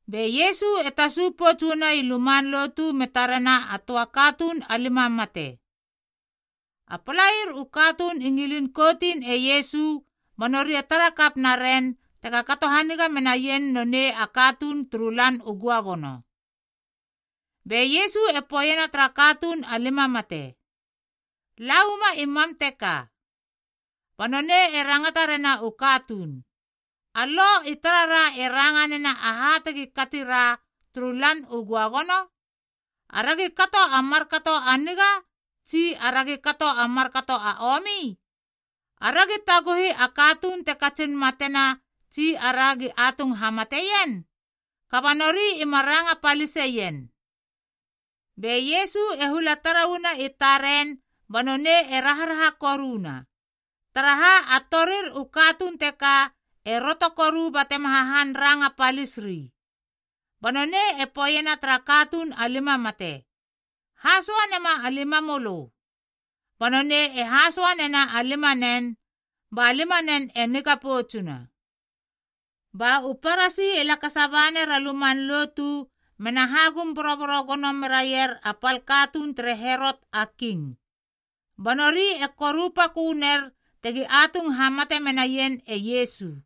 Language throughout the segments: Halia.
Be Iesu e tasu pouts uana i luman lotu me tarena a töa katuun a lima mate. A palair u katuun i ngilin koutin e Iesu ba nori e tarakap naren tega kato haniga menaien nonei a katuun turu Lan u Göagono. Be Iesu e poeiena tara katuun a limamate, “La uama i mam teka.” Ba nonei e rangata rena u katuun, “A Lo i tarara e ranga nena aha tegi kati ra turu Lan u Göagono? Aragi kato a markato a niga tsi aragi kato a markato a omi? Aragi taguhi a katuun te katsin matena tsi aragi atung hamateien?” Kaba nori ima ranga paliseien. Be Iesu e hula tara uana i taren ba nonei e raharaha koruna, taraha a torir u katuun teka e roto koru batema hahan ranga palis ri. Ba nonei e poeiena tara katuun a lima mate, “Hasoa nema a limamölö.” Ba nonei e hasoa nena a limanen ba limanen e niga poutsuna. Ba u Parasi e lakasa ba ner a luman lotu mena hagum boroboro gono meraier a pal katuun tere Herot a King. Ba nori e korupaköner tegi atung hamate menaien e Iesu.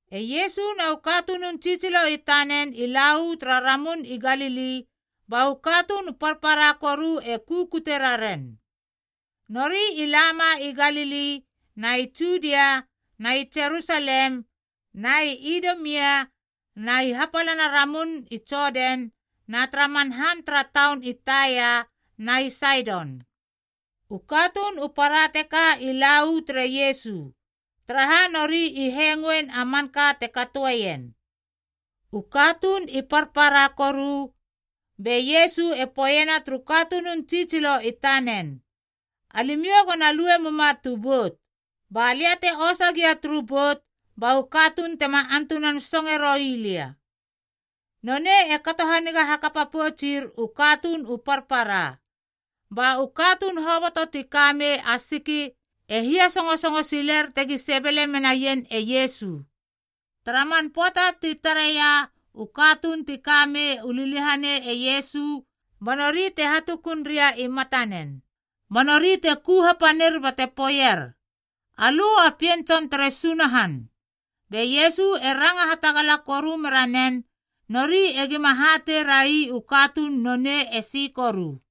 E Iesu na u katunun tsitsilo i tanen i la uu tara Ramun i Galili ba u katuun u parpara koru e kukute raren. Nori i lama i Galili na i Judia na i Jerusalem na i Idumia na i hapalana ramun i Jodan na tara man han tara taun i Taia na i Saidon. U katuun u para teka i la uu tere Iesu, taraha nori i hengoein a manka te katoeien. U katuun i parpara koru be Iesu e poeiena turu katunun tsitsilo i tanen, “Alimiou go na lue muma tu bout. Ba lia te osa gia turu bout ba u katuun tema antunan songe roi lia.” Nonei e kato haniga hakapa poutsir u katuun u parpara, ba u katuun hoboto ti ka mei a siki e hiasösongo siler tegi sebele menaien e Iesu. Tara man pöata ti tara reia u katuun ti kamei u liliahanei e Iesu, ba nori te hatukun ria i matanen. Ba nori te ku hapanir bate poeier, “Alö a Pien Tson tere Sunahan!” Be Iesu e ranga hatagala koru meranen, nori egima hatei rai u katuun nonei esi koru.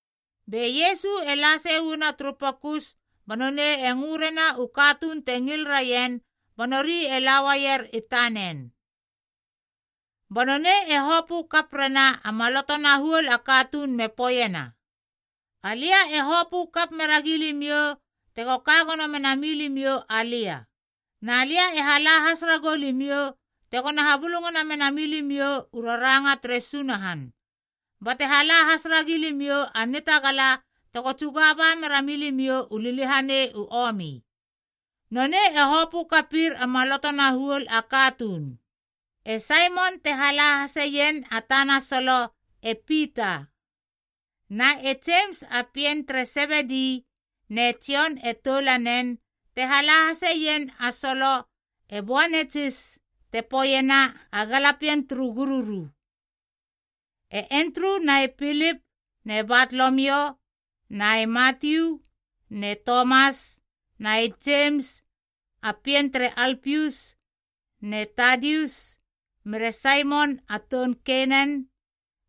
Be Iesu e la sei uana turu pokus ba nonei e ngö rena u katuun te ngil raien ba nori e la uaier i tanen. Ba nonei e hopö kap rena a maloto na huol a katuun me poeiena, “Alia e hopö kap meragi limiou tego ka gono menami limiou alia. Na lia e hala has ragou limiou, tegona habulungana mena milimiou u raranga tere Sunahan, bate hala has ragi limiou a nitagala tego tsuga ba mera milimiou u liliahanei u omi.” Nonei e hopö kapir a maloto na huol a katuun: e Saimon (te hala hasien a tana solo, e Pita). Na e Jemis a pien tere Sebedi ne Jon e toulanen (te hala haseien a solo, e Boanetsis, te poeiena a galapien turu gururu). E Endru na e Pilip ne Batolomio na e Matiu ne Tomas na e Jemis a pien tere Alpius, ne Tadius mere Saimon a toun Kenana,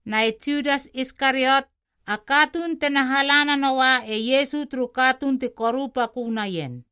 na e Judas Iskariot, a katuun tena hala nanoua e Iesu turu katuun ti korupakö naien.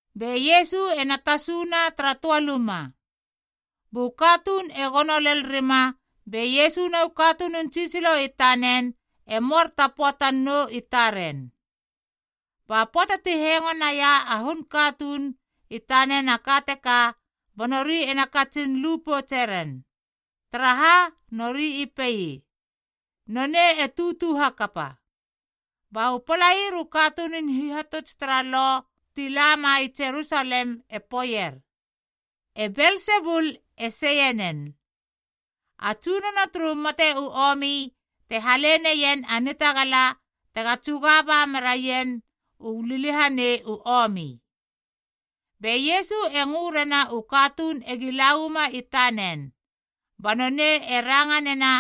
Be Iesu ena tasuna tara töa luma. Bu katuun e gono lel rima be Iesu na u katunun tsitsilo i tanen e moar ta pöatan nou i taren. Ba pöata ti hengo naia a hun katuun i tanen a ka teka, ba nori ena katsin lu poutse ren, taraha nori i pei, “Nonei e tutu hakapa.” Ba u palair u katunun hihatuts tara Lo ti lama i Jerusalem e poeier, “E Belsebul e seie nen. A tsunono turu liliahanei te hale neien a nitagala tega tsuga ba meraien u liliahanei u omi.” Be Iesu e ngö rena u katuun egi la uama i tanen, ba nonei e ranga nena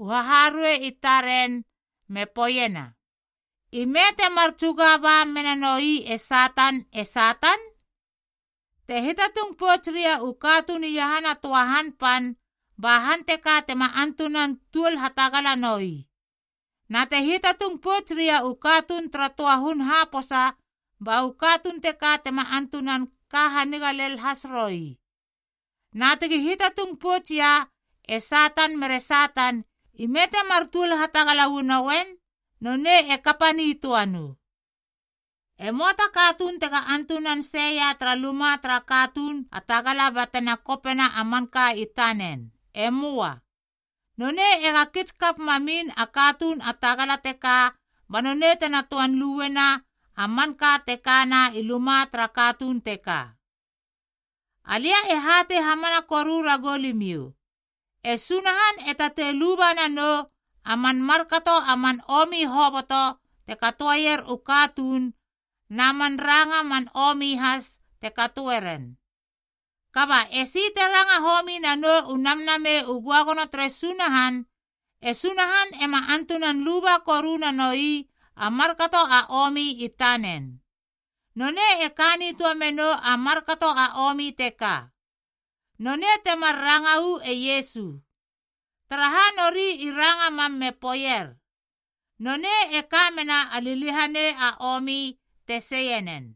u haharuei i taren me poeiena, “Ime temar tsuga ba mena noi e Satan e Satan? Te hiatatung pouts ria u katuun iahana töa han pan, ba han teka tema antunan tuol hatagala noi. Na te hiatatung pouts ria u katuun tara töa hun haposa ba u katuun teka tema antunan ka haniga lel has roi. Na tegi hiatatung pouts ia e Satan mere Satan, ime temar tuol hatagala uanoien, nonei e kapa nitöa nou. “E möa ta katuun tega antunan seia tara luma tara katuun a tagala bate na kopena a manka i tanen. E möa. Nonei ega kits kap mamin a katuun a tagala teka ba nonei tena töan luena a manka te kana i luma tara katuun teka. “Alia e hatei hamana koru ragou limiou, e Sunahan e tatei luba nanou a man markato a man omi hoboto te katoeier u katuun, na man ranga man omi has te katoe ren. Kaba esi te ranga homi nanou u Namnamei u Göagono tere Sunahan, e Sunahan ema antunan luba koru nanoi a markato a omi i tanen. Nonei e ka nitöa menou a markato a omi teka.” Nonei temar ranga uu e Iesu, taraha nori i ranga mam me poeier, “Nonei e ka mena a liliahanei a omi te seie nen.”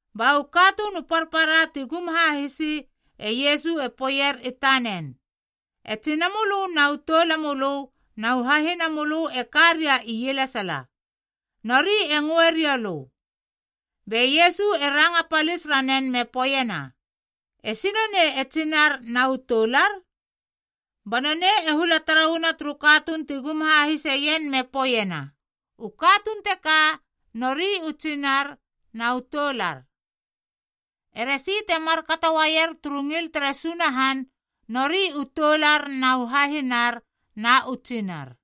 Ba u katuun u parpara ti gum hahisi e Iesu e poeier i tanen, “E tsinamölö na u toulamölö na u hahinamölö e ka ria ielesala, nori e ngöe riou lö.” Be Iesu e ranga palis ranen me poeiena, “Esi nonei e tsinar na u toular?” Ba nonei e hula tara uana turu katuun ti gum hahiseien me poeiena, “U katuun teka, nori u tsinar na u toular. Eresi te markato uaier turu ngil tere Sunahan, nori u toular na u hahinar na u tsinar.”